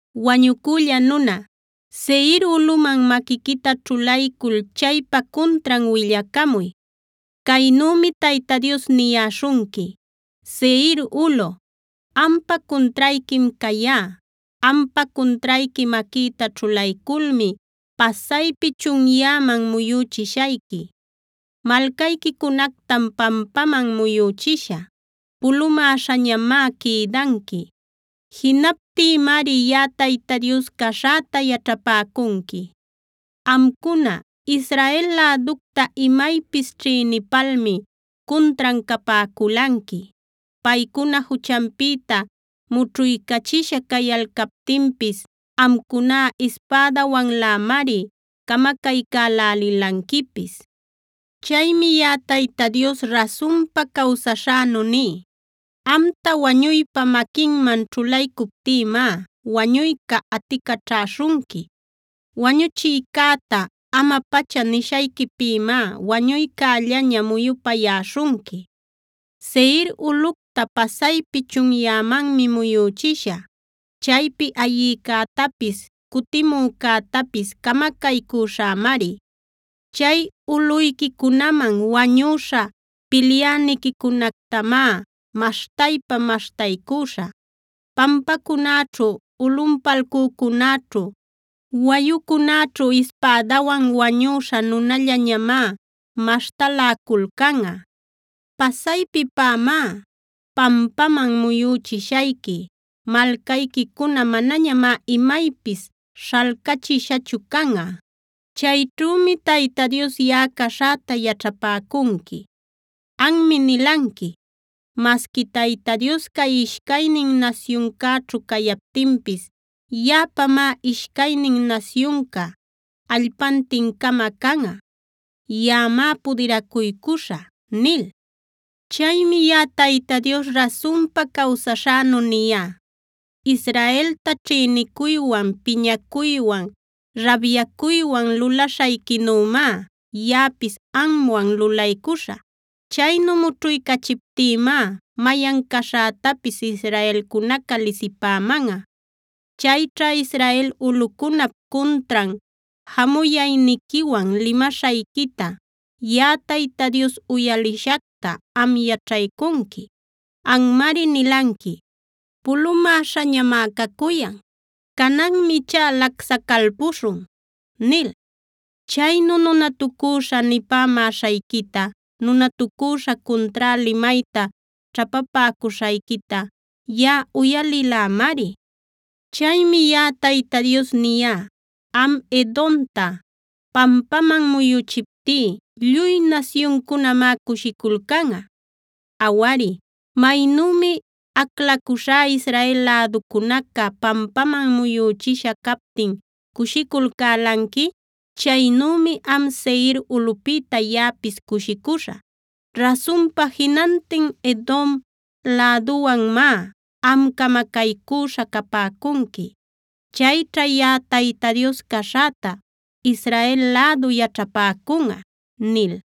“Wañucülla nuna, Seir ulꞌuman ñawiquita ćhulaycul chaypa cuntran willacamuy. Caynümi Tayta Dios niyäśhunqui: “ ‘Seir ulꞌu, ampa cuntrayquim cayá. Ampa cuntrayqui maquïta ćhulayculmi pasaypi chunyäman muyüchishayqui. Malcayquicunactam pampaman muyüchishä; pulumäśhañamá quïdanqui. Jinaptïmari yaꞌa Tayta Dios caśhäta yaćhapäcunqui. “ ‘Amcuna, Israel läducta imaypis ćhïnipalmi cuntran capäculanqui. Paycuna juchanpïta mućhuycachisha cayalcaptinpis amcuná ispädawanlämari camacaycälälilanquipis. Chaymi yaꞌa Tayta Dios rasunpa cawsaśhänu ní: Amta wañuypa maquinman ćhulaycuptïmá wañuyca aticaćhaśhunqui. Wañuchiycäta “ama-pacha” nishayquipïmá wañuycällaña muyupayäśhunqui. Seir ulꞌucta pasaypi chunyämanmi muyüchishä. Chaypi ayïcätapis, cutimücätapis camacaycüśhämari. Chay ulꞌuyquicunaman wañüśha pilyäniquicunactamá maśhtaypa maśhtaycüśhä. Pampacunäćhu, ulꞌunpalcücunäćhu, wayucunäćhu ispädawan wañüśha nunallañamá maśhtaläculcanꞌa. Pasaypipämá pampaman muyüchishayqui. Malcayquicuna manañamá imaypis śhalcachishachu canꞌa. Chayćhümi Tayta Dios yaꞌa caśhäta yaćhapäcunqui. “ ‘Anmi nilanqui: “Masqui Tayta Dios cay ishcaynin nasyuncäćhu cayaptinpis yaꞌapamá ishcaynin nasyunca allpantin-cama canꞌa. Yaꞌamá pudiracuycuśhä” nil. Chaymi yaꞌa Tayta Dios rasunpa cawsaśhänu niyá: Israelta ćhïnicuywan, piñacuywan, rabyacuywan lulaśhayquinümá yaꞌapis amwan lulaycuśhä. Chaynu mućhuycachiptïmá mayan caśhätapis israelcunaca lisipämanꞌa. Chayćha Israel ulꞌucunap cuntran jamuyayniquiwan limaśhayquita, yaꞌa Tayta Dios uyalishacta, am yaćhaycunqui. Anmari nilanqui: “Pulumäśhañamá cacuyan. Cananmi ichá lacsacalpuśhun” nil. Chaynu nunatucüśha nipämäśhayquita, nunatucüśha cuntrá limayta ćhapapäcuśhayquita, yaꞌa uyalilämari. “ ‘Chaymi yaꞌa Tayta Dios niyá: Am Edomta pampaman muyüchiptí lluy nasyuncunamá cushiculcanꞌa. Awari, maynümi aclacuśhá Israel läducunaca pampaman muyüchisha captin cushiculcälanqui, chaynümi am Seir ulꞌupïta yaꞌapis cushicuśhä. Rasunpa jinantin Edom läduwanmá am camacaycüśha capäcunqui. Chayćha yaꞌa Tayta Dios caśhäta Israel lädu yaćhapäcunꞌa’ nil.